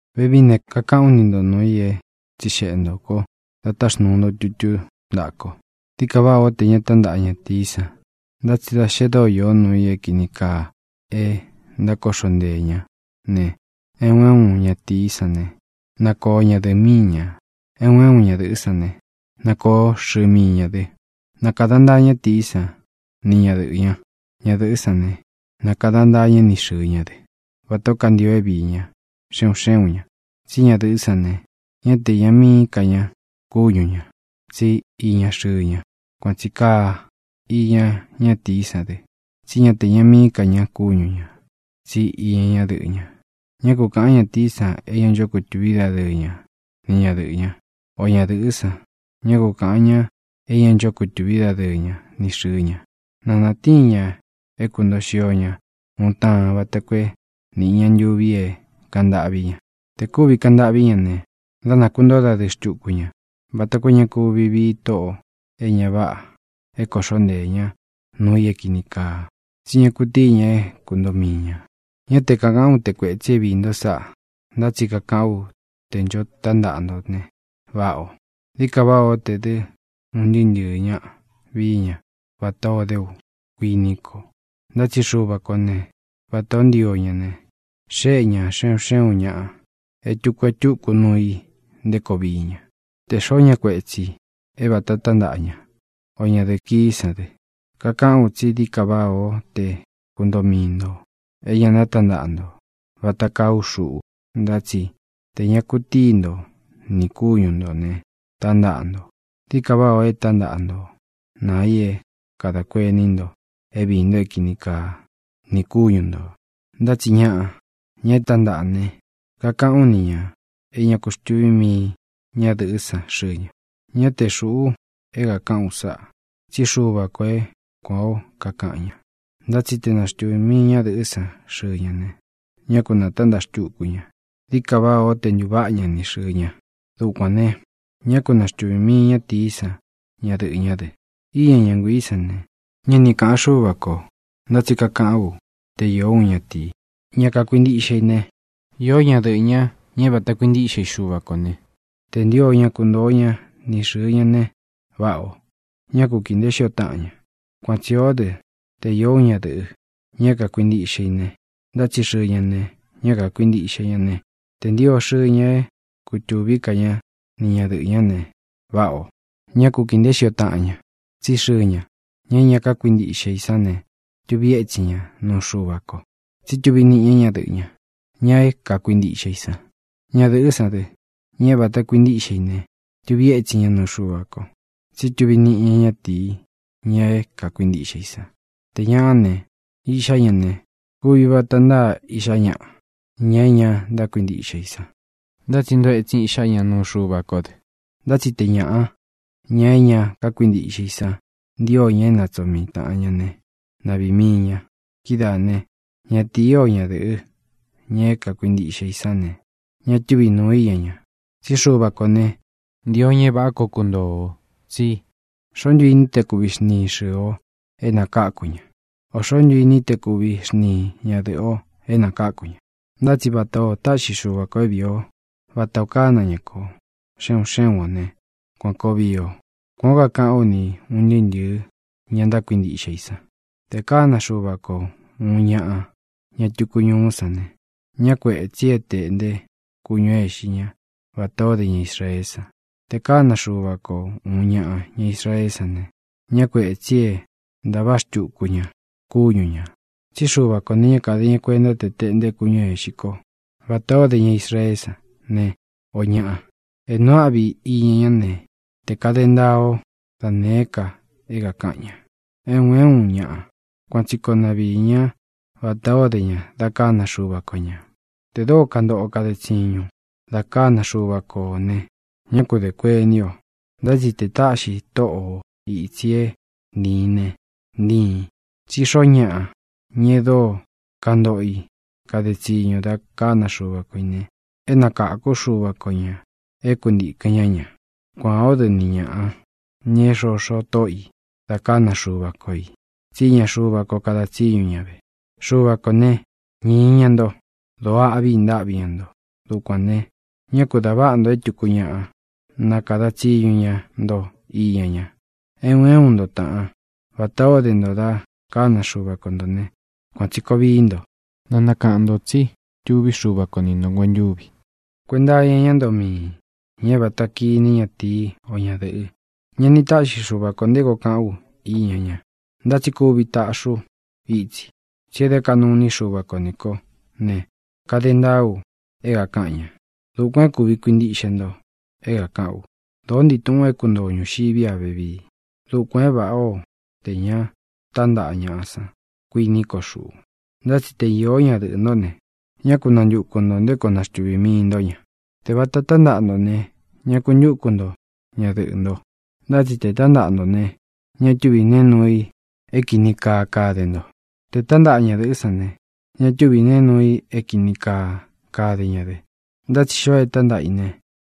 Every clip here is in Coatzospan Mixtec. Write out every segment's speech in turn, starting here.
Vevií ne, kakaꞌán u ni nto nūu i é tsixeꞌe ntō ko da táxnuu nto tutú ntaꞌa ko: Dií ka váꞌā ó tē ña tántaꞌa ñatīí san. Ntá tsi da xe dóo īó nuu i é kīni kaa e ntákoꞌxo nteē ñá ne, é un é un ñatīí san ne, na koo ñadɨ̄ꞌɨ míi ñā. É un é un ñadɨ̄ꞌɨ́ san ne, na koo xɨɨ mii ñā dɨ. Na kāda ntaa ñátīí san ni ñadɨꞌɨ̄ ña. Ñadɨ̄ꞌɨ́ san ne, na kāda ntaa ñá ni xɨ̄ɨ ña dɨ́, vatā ó kantio é viī ñá, xe un xé un ña. Tsí ñadɨ̄ꞌɨ́ san ne, ñá te iña míi ka ña kúñu ñā, tsi íña xɨɨ ña. Kuan tsī kaa iña ñatií san dɨ, tsí ña te iña míi ka ña kúñu ñā, tsí iña ñadɨꞌɨ́ ña. Ñá kū kaꞌan ñátīí san é ña ncho kutuví dadɨɨ ña ni ñadɨꞌɨ̄ ñá, o ñadɨ̄ꞌɨ́ san, ñá ku kāꞌan ñá é ña ncho kutuví dadɨɨ ña ni xɨ̄ɨ ña. Na nātíin ña é kūntoo xio ña uun taan vata koo é nīꞌi ña ntuvi é kāꞌan ntâꞌví ña. Tē kúvi kaꞌan ntâꞌví ña ne, dá nākuntóo dadɨɨ xtuku ña vata koo é ña kuvi vii tóꞌō e ña váꞌā é kōꞌxó nteē ñá nuu i é kīni kaa, tsí ña kutíi ña é kuntoo mii ñā. Ñá te kākaꞌán u te kuētsi é viī nto sáꞌa, ntá tsi kakaꞌán u tē ncho tántaꞌa nto ne, váꞌa ō. Dií ka váꞌā ó te dɨ́ un ntɨɨ́ ntɨ̄ɨ ñáꞌa vii ña vatā ó de ú, kuiní ko. Ntá tsi Xuva kō né, vatā ó ntio ña ne, xéꞌe ña xe un xé un ñaꞌa e túku e túku nuu i nté koo vií ña. Tē xoó ña kuetsī é vāta tántaꞌa ña, o ñadɨ̄ꞌɨ kií san dɨ, kakaꞌán u tsí dií ka váꞌā ó te kuntoo mii ntō é ña nátantaꞌa nto, vata kaa ú xuꞌu. Ntá tsi tē ña kutíi nto nī kúñu ntō ne, tántaꞌa ntō. Dií ka váꞌā ó e tántaꞌa ntō naa i é kadā kuení nto é viī nto é kīni kaa ni kúñu ntō. Ntá tsi ñaꞌa, ña e tántaꞌa ne, kakaꞌán u ni ñā é ña ku xtuví mii ñadɨꞌɨ́ san xɨɨ ña. Ñá te xūꞌu é kākaꞌán u sáꞌa, tsí Xuva kō é kuān ó kakaꞌan ña. Ntá tsi te naxtuvī mii ñadɨꞌɨ́ san xɨɨ ña ne, ñá ku nātántaꞌa xtuku ña. Dií ka váꞌā ó te ntūváꞌa ña ni xɨ̄ɨ ña. Dukuān ne, ñá ku na xtuvī mii ñátīí san ñadɨꞌɨ̄ ñá dɨ. Íña ña nguiī sán ne, ñá ni kāꞌan Xúva kō. Ntá tsi kakaꞌán u te īó uun ñatīí, ña kakuintiꞌxe i ne, īó ñadɨꞌɨ̄ ñá, ña é vata kuintíꞌxe i Xuva kō né, tē ntio ña kuntoo ña ni xɨ̄ɨ ña ne, váꞌā o. Ñá ku kīi nteé xio taꞌan ña. Kuan tsī o dɨ́, te īó uun ñadɨ̄ꞌɨ, ña é kākuintiꞌxe i ne, ntá tsi xɨɨ ña ne, ñá kākuintiꞌxe ña ne, tē ntio xɨɨ ña é kutūví ka ña ni ñadɨꞌɨ̄ ñá ne, váꞌā o. Ñá ku kīi nteé xio taꞌan ña. Tsí xɨɨ ña, ña é ña kákuintiꞌxe i sán ne, tuvi étsin ña nuu Xuva ko, tsí tuvi niꞌi ña ñadɨꞌɨ́ ña, ña é kākuintiꞌxe i san. Ñadɨ̄ꞌɨ́ san dɨ, ña é vāta kuintíꞌxe i ne, tuvi étsin ña nuu Xuva ko, tsí tuvi niꞌi ña ñatii, ña é kākuintiꞌxe i san. Tē ñaꞌá ne, iꞌxá ña ne, kuvi vata ntáa iꞌxá ñaꞌa, ña é ña ntákuintiꞌxe i san. Ntá tsi ntoo etsin iꞌxá ña nuu Xuva kó dɨ. Ntá tsi te ñāꞌa, ña é ña kákuintiꞌxe i san, ntío ña é natsoo mii tāꞌan ña né, na viī mii ña. Kidáā né, ñatīí o ñadɨ̄ꞌɨ́, ña é kākuintiꞌxe i sán ne, ña túvi nūu i íña ña. Tsí Xuva kō ne, ntio ña é vāꞌá ko kuntoo ō. Tsí ¿xoó ntu ini í te kuvi xntiin xɨ̄ɨ o é nakakū ña? ¿Ō xoó ntu ini í te kuvi xntiin ñadɨ̄ꞌɨ o é nakakū ña? Ntá tsi vata ō táꞌxi Xuva kō é viī ó, vata ō kána ña kō, xe un xé un o ne, kuān koo vii o. Kuān ó kakaꞌán u ni ūn ntɨɨ́ ntɨ̄ɨ́ ña ntákuintiꞌxe i san. Tē kána Xuva ko uun ñaꞌa, ña tuku ñuú san ne, ñá kuētsi é tēꞌnté kúñū é ixi ñá vatā ó de ña Israeé san. Tē kána Xuva ko ūun ñaꞌa, ña Israeé san ne, ñá kuētsi é ntavaꞌa xtuku ña kúñu ñā. Tsí Xuva kō ne, ñá kāde ña kuenta te teꞌnte kúñū é ixi ko vatā ó de ña Israeé san ne, ō ñaꞌa. É nuu áꞌvi iña ñá ne, te kāde ntaa ó da nēé ka é kākaꞌan ña. É un é un ñaꞌa, kuan tsi koo na viī ñá vatā o dé ña da kána Xuva ko ñā. Tē dóo kantoꞌo o kaden tsiñūn da kána Xuva ko ō ne, ñá ku dē kuení o. Ntá tsi te tāꞌxi tóꞌo o ītsi é ntiin ne, ntiin. Tsí xoo ñáꞌa, ña e dóo kantoꞌo i kade tsiñu da kána Xuva ko ī ne, é nakākú Xuva ko ñā é kuntīkɨn ñá ña. Kuān ó dɨ ni ñāꞌa, ñā é xoxo tóꞌo ī da kána Xuva ko ī, tsí iña Xuva ko kada tsiñu ña ve. Xuva kō né, ñīi ña nto. Dōo áꞌvī ntáꞌvi ña nto. Dukuān ne, ñá ku dā váꞌa nto é tuku ñaꞌa nakāda tsiñu ña nto iña ña. É un é un nto, tāꞌán, vatā o dé nto da kána Xuva ko ntō né, kuan tsī koo vií nto. Na nakaꞌan ntō tsí tuví Xuva ko ni ntō nguentúvi. Kuenta iña ñá ntoo miī, ña é vāta kiní ñatīí o ñadɨ̄ꞌɨ, ña é vāta tántaꞌa ne, ña ni táꞌxi Xuva kō nté koo kaꞌán u iña ña. Ntá tsi kuvi taꞌxi ú itsi, tsi e dé kaꞌnu iní Xuva ko nī kó ne, kade ntaa u é kākaꞌan ña. Dukuān é kuvi kuintiꞌxe nto é kākaꞌán u. Dōó ntii tūꞌun é kuntoo o ñūxiví a vevii. Dukuān é vāꞌá o tē ña tántaꞌa ñāꞌa san, kuiní ko xuꞌu. Ntá tsi te īó ñadɨꞌɨ̄ ntó ne, ña ku nantuku ntō nté koo naxtuvī mii nto ña. Tē vata tántaꞌa nto ne, ñá ku ntuku nto ñadɨꞌɨ̄ nto. Ntá tsi tē tántaꞌa nto ne, ña túvī neé nuu i é kīni kaa kade nto. Tē tántaꞌa ñadɨ̄ꞌɨ́ san ne, ña túvī neé nuu i é kīni kaa kade ña dɨ. Ntá tsi xoo é tántaꞌa i ne,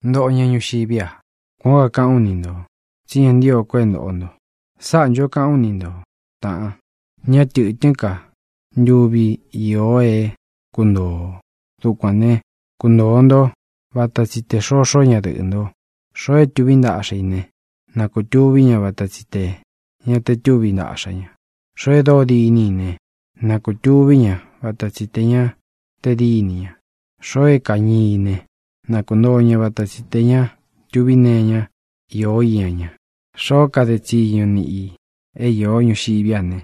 ntoꞌo ña ñuxiví a. Kuān ó kakaꞌán u ni ntō, tsí ña ntío ko é ntōꞌo nto. Sáꞌā ncho kaꞌán u ni nto, tāꞌan: Ñá tɨ̄tɨ́n ka ntuvi īo é kuntoo o. Dukuān né, kuntōo ntó vata tsi tē xoxó ñadɨꞌɨ̄ nto. Xoo é tuví ntaꞌxa i ne, na kūtuví ña vata tsi tē ña te túvi ntaꞌxa ña. Xoo e dóo diní i ne, na kūtuví ña vata tsi tē ña te díni ña. Xoo é kañii i ne, na kuntoo ña vata tsi tē ña tuví nee iñá īó iña ña. Xoo é kade tsiñu niꞌi ī é īó ñuxiví a ne,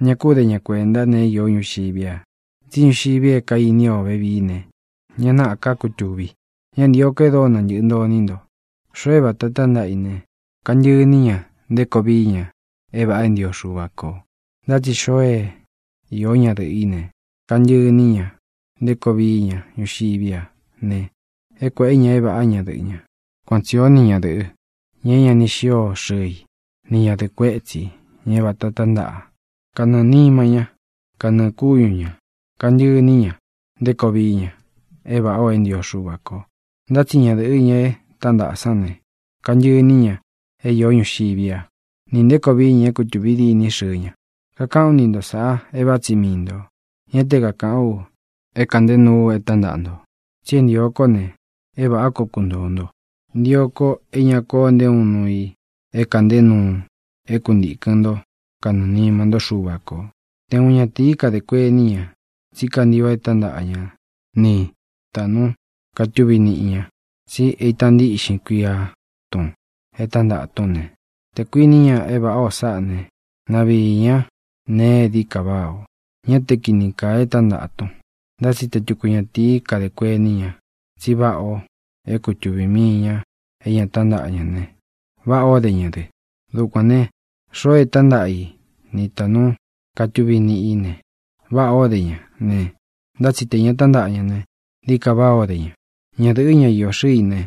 ña kú de ña kuenta neé īó ñuxiví a, tsí ñuxivi é kaīni o vevíi ne, ña náꞌa ká kutūvi. Ñá ntīo ko e dóo nantɨꞌɨ nto iní nto. Xoo é vāta tántaꞌa i ne, kantɨꞌɨ iní ña nté koo vií ña é vāꞌa é ntio Xuva ko. Ntá tsi xoo é īó ñadɨꞌɨ̄ í ne, kantɨꞌɨ iní ña nté koo vií ña ñuxiví a ne, é kuēꞌe ña é vāꞌá ñadɨꞌɨ̄ ña. Kuan tsī ó ni ñadɨ̄ꞌɨ, ña é ña ni xío xɨɨ i, ni ñadɨ̄ꞌɨ kuetsí, ña é vāta tántaꞌa: kanɨɨ̄ nima ñá, kanɨɨ̄ kúñu ña kāntɨꞌɨ iní ña nté koo vií ña é vāꞌa é ntio Xuva ko. Ntá tsi ñadɨ̄ꞌɨ, ña é tántaꞌa sán ne, kantɨꞌɨ iní ña é īó ñuxiví a, nī nté koo vií ña é kutūvi diní xɨɨ ña. Kakaꞌán u ni nto sāꞌa é vāꞌá tsi mii ntō. Ñá te kākaꞌán u é kāꞌnté nuu u e tántaꞌa ntō. Tsí é ntio ko ne, é vāꞌá koo kuntōo nto. Ntio ko é ña koo nté uun nuu i é kāꞌnté nuu é kuntīkɨn ntó kanɨɨ̄ nima ntó Xuva kō. Te uun ñatīí kadē kuení ña tsí kantio é tántaꞌa ña ni tāꞌnu katuví niꞌi ñā, tsi é ita ntíꞌxin kuia tun é tántaꞌa tún ne, tē kuiní ña é vāꞌá o sáꞌa ne, na viī ña nee é dií ka váꞌā o. Ñá te kini kaa é tántaꞌa tun. Ntá tsi te tuku ñatīí kadē kuení ña tsí váꞌā o é kutuvī mii ña é ña tántaꞌa ña ne, váꞌā ó de ña dɨ. Dukuān ne, xoo é tántaꞌa i ni tāꞌnu katuví niꞌī ne, váꞌā ó de ña ne, ntá tsi tē ña tántaꞌa ña ne, dií ka váꞌā ó de ña. Ñadɨ̄ꞌɨ́, ña iō xɨ́ɨ i ne,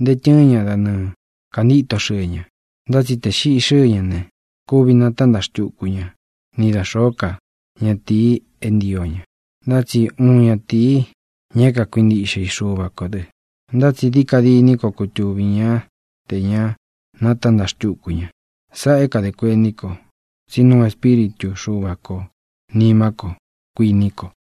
ntee tɨɨ́n ña da nɨɨ kāntíto xɨɨ ña. Ntá tsi tē xiꞌi xɨ́ɨ ña ne, kuvi natántaꞌa xtuku ñá ni da xōó ka ñatīi é ntio ña, ntá tsi uun ñatīi, ña é kakuintiꞌxe i Xuva kō dɨ. Ntá tsi dií ka diní koo kutuvī ñá tē ña nátantaꞌa xtúku ña. Sáꞌā é kadē kuení ko, tsí nuu Espíritū Xúva kō nimá ko, kuiní ko.